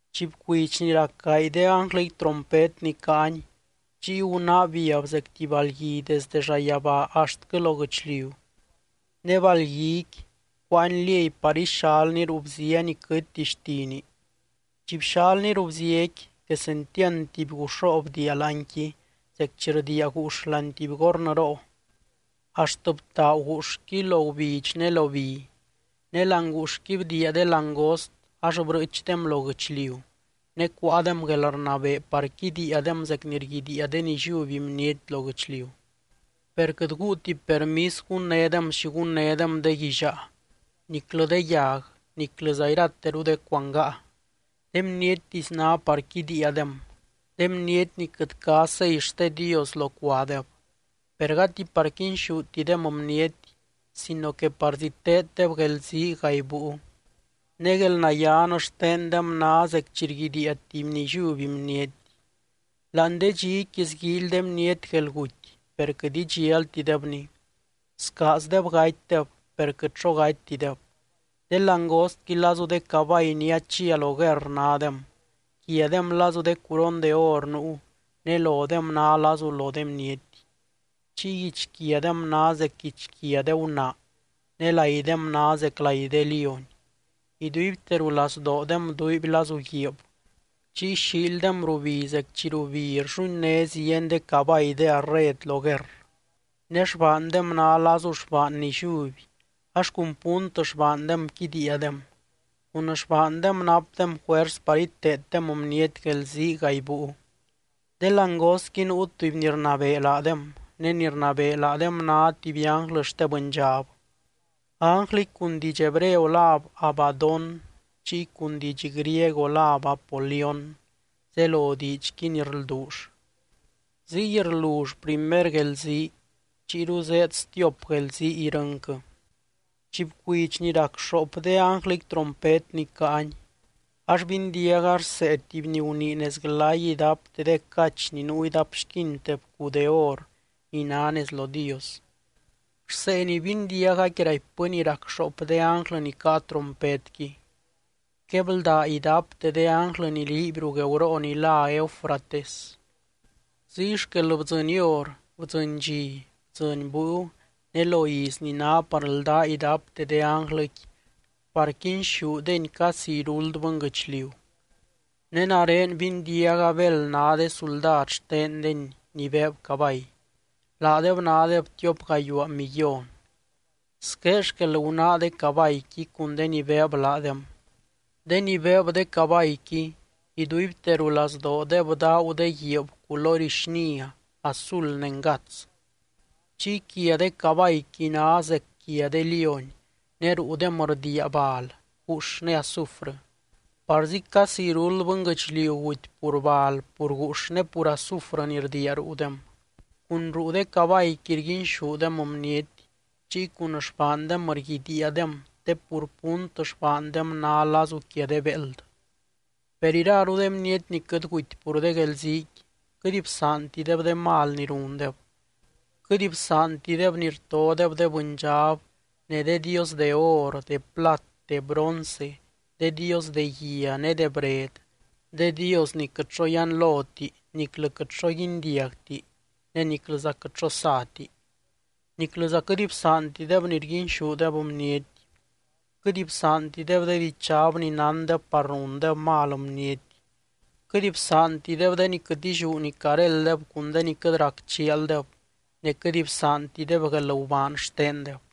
Chi bcuidx ni rac gaay de ánglɨqui trompet ni caany, chiy gunáa biab zec tuby balgui desde llayabaa axtquɨ lo guɨchliu, ne balqui cuáani liey par ixalni ruu bzia ni quɨtti xtini. Chi bxalni ruu bziaqui quesentiand tuby guuxroo bdiia láanqui zec chi rdiia guux láani tuby gornɨroo, axt btaagu guuxqui lo gubidx ne lo bi. Ne láani guuxqui bdiia de langost ax brɨɨchdem lo guɨchliu, ne cuáadem guelrnabee par quidiiadem zec ni rguidiia de nilliuby bniety lo guɨchliu. Per quɨt guuti permis gunnédem xi gunnédem de guillaa, niclɨ de yag niclɨza irateru de cuangaa. De bniettisy ná par quidiiadem, de bniety ni quɨt cá sei xte Dios locuadeb. Per gati par quinxútidem bniety, sino que parzí teeddeb guelzii gaay búiu. Ne guelnayían xtendem ná zec chi rguidiia tuby nilliuby bniety. Láani de dxiqui sguíily de bniety guelguty, per quɨt idxialtidebni. Scaazdeb gatydeb, per quɨt xo gatytideb. De langostqui lazu de cabay ni achia lo guerr nádem, quiadem lazu de curon de or nuu, ne lodem ná lazu lo de bniety. Chiy guichquiadem ná zec guichquia de gunaa, ne laidem ná zec lai de lióny. Iduibte rulazdoodem duuiby lazu guiib, chiy xiildem rubi zec chi rubi rlluinné zieny de cabay de arred lo guerr. Ne xbaandem ná lazu xbaan nilliuby, ax cun punt xbaandem quidiiadem. Cun xbaandem napdem juers par iteeddem bniety guelzii gaay búiu. De langostqui nuu tuby ni rnabee laadem, ne ni rnabee laadem ná tuby ánglɨ xte bɨndxab. Ánglɨqui cun diidx hebreo láb Abadón, chiy cun diidx griego láb Apolión, zelo diidxqui ni rlduull. Ziy rlull primer guelzii, chiyru zéed stiop guelzii irɨnquɨ. Chi bcuidx ni rac xoop de ánglɨqui trompet ni caany, ax bindiaga rsee tuby ni gunii nez glay idapte de cach ni nuu idapxquinte bcuu de or ni ná nez lo Dios. Rsee ni bindiagaqui raipbɨ ni rac xoop de ánglɨ ni caa trompetqui: —Quebldá idapte de ánglɨ ni liiby ruu gueuroo ni lá Eufrates. Ziy xquel bdzɨny hor, bdzɨny dxi, bdzɨny búiu ne lo iz ni ná par ldá idapte de ánglɨqui par quinxúdeny casi iruld bɨnguɨchliu. Ne nare bindiaga béld ná de suldad xtendeny ni beeb cabay. Laadeb nádeb tiop gayuaa millón. Squé xquel gunáa de cabayqui cun de ni beeb laadem: De ni beeb de cabayqui iduibte rulazdoodeb daagu de guiib culory xnia, azul ne ngats. Chiy quia de cabayqui ná zec quia de lióny, ne ruudem rdiia bal, guux ne azufrɨ. Parzi casi iruld bɨnguɨchliu guty pur bal, pur guux ne pur azufrɨ ni rdiia ruudem. Cun ruu de cabayqui rguinxúdem bniety, chiy cun xbaandem rguidiiadem te pur punt xbaandem ná lazu quia de béeld. Per iraru de bniety ni quɨt guty pur de guelziiqui, quɨt bsaantideb de mal ni rundeb. Quɨt bsaantideb ni rtodeb de bɨndxab ne de dios de or, de plat, de bronce, de dios de guia ne de bred, de dios ni quɨt xo yianloti niclɨ quɨt xo guindiagti ne niclɨza quɨt xo sati. Niclɨza quɨt bsaantideb ni rguinxúdeb bniety, quɨt bsaantideb de dichab ni nándeb par rundeb mal bniety, quɨt bsaantideb de ni quɨt illiú ni carélddeb cun de ni quɨt rac chialdeb, ne quɨt bsaantideb guelgubaan xtendeb.